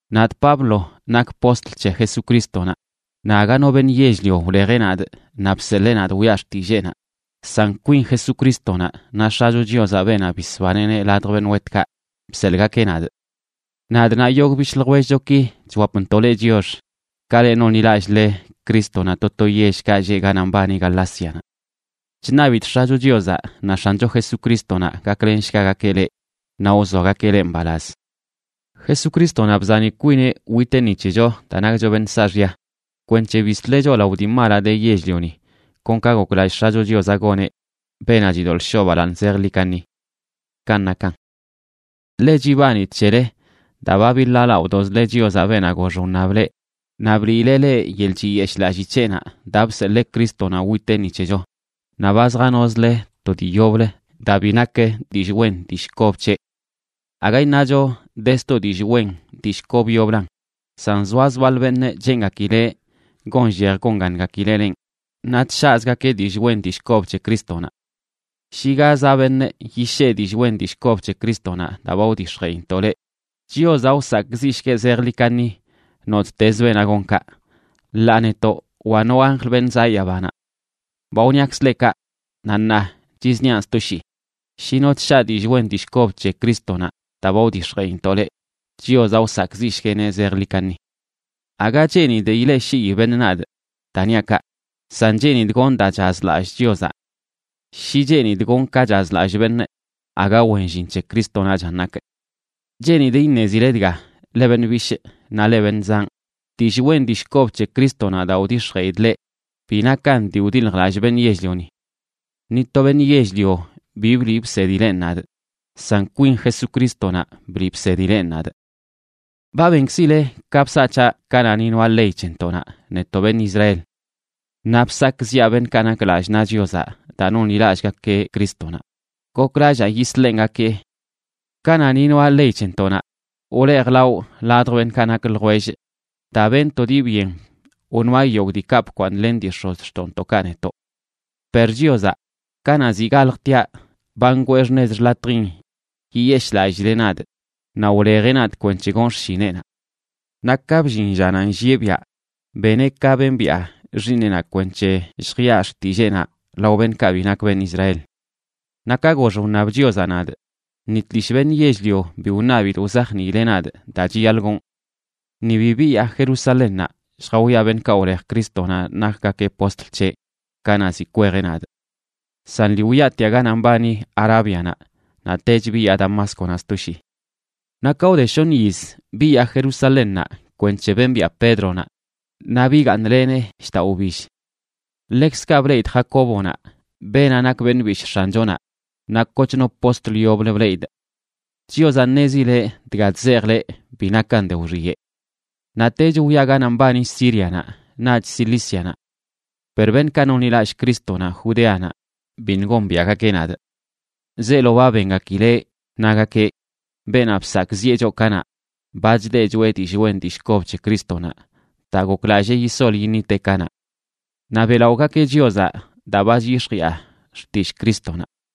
Nadꞌ Pablo, nakꞌ postl c̱he Jesucrístonaꞌ, naꞌ aga no beṉꞌ yell-lio wlejeꞌ nadꞌ naꞌ bseḻee nadꞌ wiꞌa xtilleenaꞌ, san kwin Jesucrístonaꞌ naꞌ X̱acho Chiozaꞌ, beenaꞌ bisbaneꞌneꞌ ladj beṉꞌ wetkaꞌ, bseḻꞌgakeꞌ nadꞌ. Nadꞌ naꞌ yogꞌ bishꞌ ljwellchoki chwapntoꞌ leꞌ chiox, ka le nonḻilallꞌle Crístonaꞌ to to yellkaꞌ lleꞌ ganaꞌ mbani Galácianaꞌ. Chṉabidꞌ X̱acho Chiozaꞌ naꞌ X̱ancho Jesucrístonaꞌ gaklenshgagakeꞌ leꞌ naꞌ wzoagakeꞌ leꞌ mbalaz. Jesucrístonaꞌ bzani kwineꞌ witeꞌ ni c̱hecho daa nakcho beṉꞌ saaxya, kwenc̱he bisleꞌ choꞌ lao dii malaꞌ de yell-lioni, kon ka goklallꞌ X̱acho Chiozaꞌ goneꞌ, beenaꞌ chidoḻꞌ shoꞌ balaaṉ zejḻi kaṉi. Kanꞌ nakan. Ḻe chibanidꞌ c̱hele daa ba biḻaalaꞌodozle Chiozaꞌ, beenaꞌ gox wṉab leꞌ naꞌ bliileꞌ leꞌ yeḻꞌ chiyeshꞌlalli c̱heꞌnaꞌ daa bseḻee Crístonaꞌ witeꞌ ni c̱hecho, naꞌ ba zjanozle to dii yoblə daa bi nak dillꞌ wen dillꞌ kob c̱heꞌ. Aga iṉacho de sto dillꞌ wen dillꞌ kob yoblan, san zoaz baḻ beṉꞌ cheengakileꞌ gonllej gongangakileꞌ lenꞌ, naꞌ chshaꞌzgakeꞌ dillꞌ wen dillꞌ kob c̱he Crístonaꞌ. Shi ga zaꞌ beṉꞌ yishee dillꞌ wen dillꞌ kob c̱he Crístonaꞌ daa ba wdix̱jeꞌintoꞌ leꞌ, Chiozaꞌ wsakꞌziꞌshgueꞌ zejḻi kaṉi nottezə beenaꞌ gon kaꞌ, ḻaa netoꞌ wa no anjl beṉꞌ zaꞌ yabanaꞌ. Ba wṉiakzəꞌ leꞌ kaꞌ, naꞌ ṉaa chizniaꞌn sto shii: shi no chshaꞌ dillꞌ wen dillꞌ kob c̱he Crístonaꞌ daa ba wdix̱jeꞌintoꞌ leꞌ, Chiozaꞌ wsakꞌziꞌshgueꞌneꞌ zejḻi kaṉi. Aga cheenidꞌ ileꞌshii beṉꞌ nadꞌ daa niaꞌ kaꞌ, san cheenidꞌ gonꞌ daa chazlallꞌ Chiozaꞌ. Shi cheenidꞌ gonꞌ ka chazlallꞌ beṉꞌ, aga wen llin c̱he Crístonaꞌchan nakꞌ. Cheenidꞌ iṉezile dga, leꞌ beṉꞌ bishꞌ naꞌ leꞌ beṉꞌ zanꞌ, dillꞌ wen dillꞌ kob c̱he Crístonaꞌ daa wdix̱jeꞌidꞌ leꞌ bi nakan dii wdiljlallꞌ beṉꞌ yell-lioni. Ni to beṉꞌ yell-lio bi bliꞌ bsedileꞌn nadꞌ, san kwin Jesucrístonaꞌ bliꞌ bsedileꞌn nadꞌ. Ba benkzileꞌ ka bsaꞌ c̱haꞌ kanaꞌ ni noaꞌ ley c̱hentoꞌnaꞌ, netoꞌ beṉꞌ Israel. Naꞌ bsakꞌziꞌa beṉꞌkaꞌ nak lallꞌ naꞌ Chiozaꞌ daa nonḻilallꞌgakeꞌ Crístonaꞌ, goklallaa yisḻengakee. Kanaꞌ ni noaꞌ ley c̱hentoꞌnaꞌ, wlejlawꞌ ladj beṉꞌkaꞌ nak ljwellꞌ daa benꞌ to dii byen wnoaꞌ yogꞌ diikaꞌ bkwaaṉlen dii x̱ozxtoꞌntoꞌkaꞌ netoꞌ. Per Chiozaꞌ, kanaꞌ ziꞌ galjtiaꞌ, ba ngwee xṉez xḻatjin yiyeshꞌlallileꞌ nadꞌ, naꞌ wlejeꞌ nadꞌ kwenc̱he gonꞌ xshineꞌnaꞌ. Naꞌ ka bllin llanaꞌ nllieꞌ biaꞌ, beneꞌ ka bembiꞌa Xiiṉeꞌnaꞌ kwenc̱he lljiꞌa xtilleenaꞌ lao beṉꞌkaꞌ bi nak beṉꞌ Israel. Naꞌ ka gox wṉab Chiozaꞌ nadꞌ, ni tlishꞌ beṉꞌ yell-lio bi wṉabidꞌ wzajniileꞌ nadꞌ daa chiyaḻꞌ gonꞌ. Ni bi biyaa Jerusalénnaꞌ lljawiaꞌ beṉꞌkaꞌ wlej Crístonaꞌ nakgakeꞌ postl c̱heꞌ kanaꞌ ziꞌ kwejeꞌ nadꞌ. San lii wyaatiaꞌ ganaꞌ mbani Arábianaꞌ, naꞌtech biyaa Damásconaꞌ sto shii. Naꞌ ka wde shoṉ yiz, biyaa Jerusalénnaꞌ kwenc̱he bembiꞌa Pédronaꞌ, naꞌ bigaaṉlenee shdaꞌ wbill. Ḻekzkaꞌ bleꞌidꞌ Jacóbonaꞌ, beenaꞌ nak beṉꞌ bishꞌ X̱anchonaꞌ, naꞌ kochno postl yoblə bleꞌidꞌ. Chiozaꞌ ṉezileꞌ dga chzejꞌ leꞌ bi nakan de wxiyeꞌ. Naꞌtech wyaa ganaꞌ mbani Sírianaꞌ naꞌch Cilícianaꞌ. Per beṉꞌkaꞌ nonḻilallꞌ Crístonaꞌ Judéanaꞌ biṉꞌ gombiaꞌgakeꞌ nadꞌ. Zeelo ba bengakileꞌ nagakeꞌ: “Beenaꞌ bsakꞌziꞌe choꞌ kanaꞌ, ba chdeꞌ choeꞌ dillꞌ wen dillꞌ kob c̱he Crístonaꞌ daa goklallee yisol yiṉiteꞌ kanaꞌ.” Naꞌ beꞌlaꞌogakeꞌ Chiozaꞌ daa ba chyix̱jiꞌa xtillꞌ Crístonaꞌ.